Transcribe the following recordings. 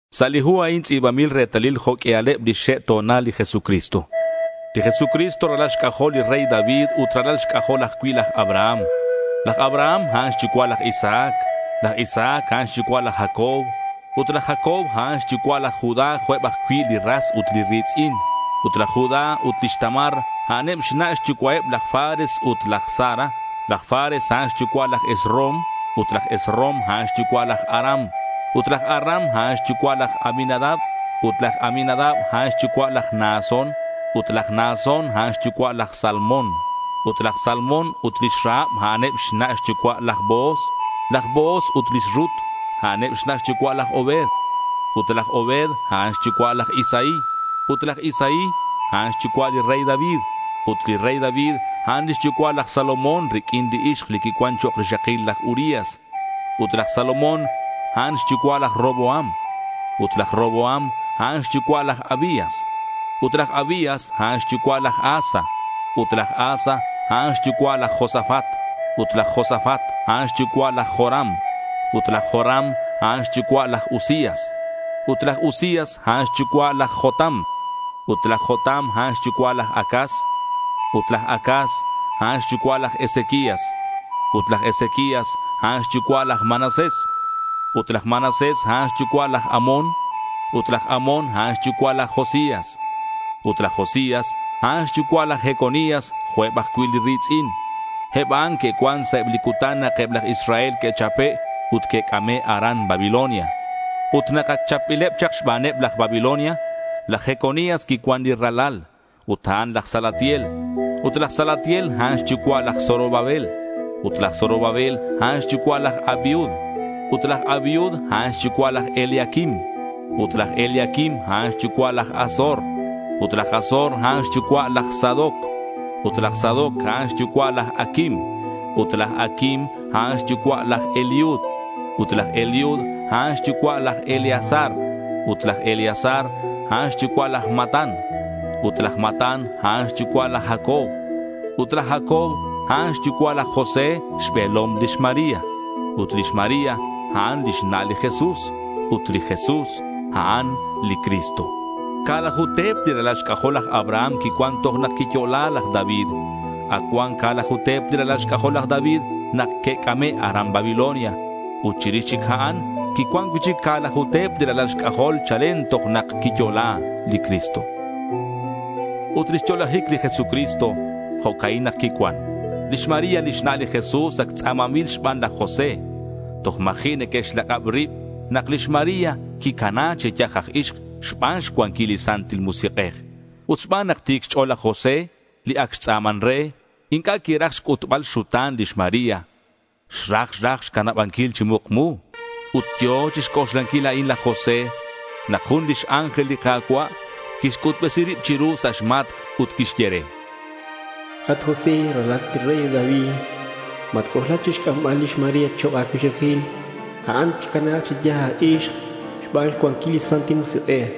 Sa' li hu a'in tz'i̱banbil retalil jo' q'uialeb lix xe' xto̱nal li Jesucristo. Li Jesucristo ralal xc'ajol li rey David ut ralal xc'ajol ajcui' laj Abraham. Laj Abraham, a'an xyucua' laj Isaac. Laj Isaac, a'an xyucua' laj Jacob. Ut laj Jacob, a'an xyucua' laj Judá jo' eb ajcui' li ras ut li ri̱tz'in. Ut laj Judá ut lix Tamar, a'aneb xna' xyucua'eb laj Fares ut laj Zara. Laj Fares, a'an xyucua' laj Esrom. Ut laj Esrom, a'an xyucua' laj Aram. Ut laj Aram, a'an xyucua' laj Aminadab. Ut laj Aminadab, a'an xyucua' laj Naasón. Ut laj Naasón, a'an xyucua' laj Salmón. Ut laj Salmón ut lix Rahab, a'aneb xna' xyucua' laj Booz. Laj Booz ut lix Rut, a'aneb xna' xyucua' laj Obed. Ut laj Obed, a'an xyucua' laj Isaí. Ut laj Isaí, a'an xyucua' li rey David. Ut li rey David, a'an lix yucua' laj Salomón riq'uin li ixk li quicuan chok' rixakil laj Urías. Ut laj Salomón, a'an xyucua' laj Roboam. Ut laj Roboam, a'an xyucua' laj Abías. Ut laj Abías, a'an xyucua' laj Asa. Ut laj Asa, a'an xyucua' laj Josafat. Ut laj Josafat, a'an xyucua' laj Joram. Ut laj Joram, a'an xyucua' laj Uzías. Ut laj Uzías, a'an xyucua' laj Jotam. Ut laj Jotam, a'an xyucua' laj Acaz. Ut laj Acaz, a'an xyucua' laj Ezequías. Ut laj Ezequías, a'an xyucua' laj Manasés. Ut laj Manasés, a'an xyucua' laj Amón. Ut laj Amón, a'an xyucua' laj Josías. Ut laj Josías, a'an xyucua' laj Jeconías jo' eb ajcui' li ri̱tz'in. Eb a'an que'cuan sa' eb li cutan nak eb laj Israel que'chape' ut que'c'ame' aran Babilonia. Ut nak ac chapbileb chak xbaneb laj Babilonia, laj Jeconías quicuan li ralal. Ut a'an laj Salatiel. Ut laj Salatiel, a'an xyucua' laj Zorobabel. Ut laj Zorobabel, a'an xyucua' laj Abiud. Ut laj Abiud, a'an xyucua' laj Eliaquim. Ut laj Eliaquim, a'an xyucua' laj Azor. Ut laj Azor, a'an xyucua' laj Sadoc. Ut laj Sadoc, a'an xyucua' laj Aquim. Ut laj Aquim, a'an xyucua' laj Eliud. Ut laj Eliud, a'an xyucua' laj Eleazar. Ut laj Eleazar, a'an xyucua' laj Matán. Ut laj Matán, a'an xyucua' laj Jacob. Ut laj Jacob, a'an xyucua' laj José, xbe̱lom lix María. Ut lix María, a'an lix na' li Jesús. Ut li Jesús, A'an li Cristo. Ca̱laju te̱p li ralal xc'ajol laj Abraham quicuan toj nak quiyo'la laj David. Ac cuan ca̱laju te̱p li ralal xc'ajol laj David nak que'c'ame' aran Babilonia. Ut chirix chic a'an, quicuan cui'chic ca̱laju te̱p li ralal xc'ajol chalen toj nak quiyo'la li Cristo. Ut lix yo'lajic li Jesucristo, jo'ca'in nak quicuan: Lix María lix na' li Jesús ac tz'a̱manbil xban laj José. Toj ma̱ji' neque'xlak'ab rib nak lix María quicana chi yaj aj ixk xban xcuanquil li Santil Musik'ej. Ut xban nak ti̱c xch'o̱l laj José, li ac xtz'a̱man re, inc'a' quiraj xc'utbal xxuta̱n lix María. Xraj raj xcanabanquil chi mukmu. Ut yo̱ chixc'oxlanquil a'in laj José nak jun lix ángel li Ka̱cua' quixc'utbesi rib chiru sa' xmatc' ut quixye re: —At José, ralalat li rey David, matc'oxlac chixc'ambal lix María chok' a̱cuixakil. A'an xcana chi yaj aj ixk xban xcuanquil li Santil Musik'ej.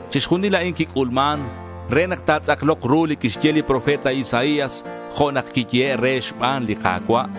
Chixjunil a'an quic'ulman re nak ta̱tz'aklok ru li quixye li profeta Isaías jo' nak quiyehe' re xban li Ka̱cua'.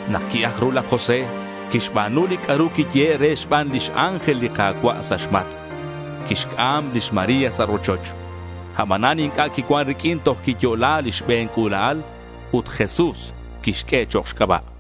Nak qui-aj ru laj José, quixba̱nu li c'a'ru quiyehe' re xban lix ángel li Ka̱cua' sa' xmatc'. Quixc'am lix María sa' rochoch. Abanan inc'a' quicuan riq'uin toj quiyo'la li xbe̱n c'ula'al. Ut Jesús quixq'ue chok' xc'aba'.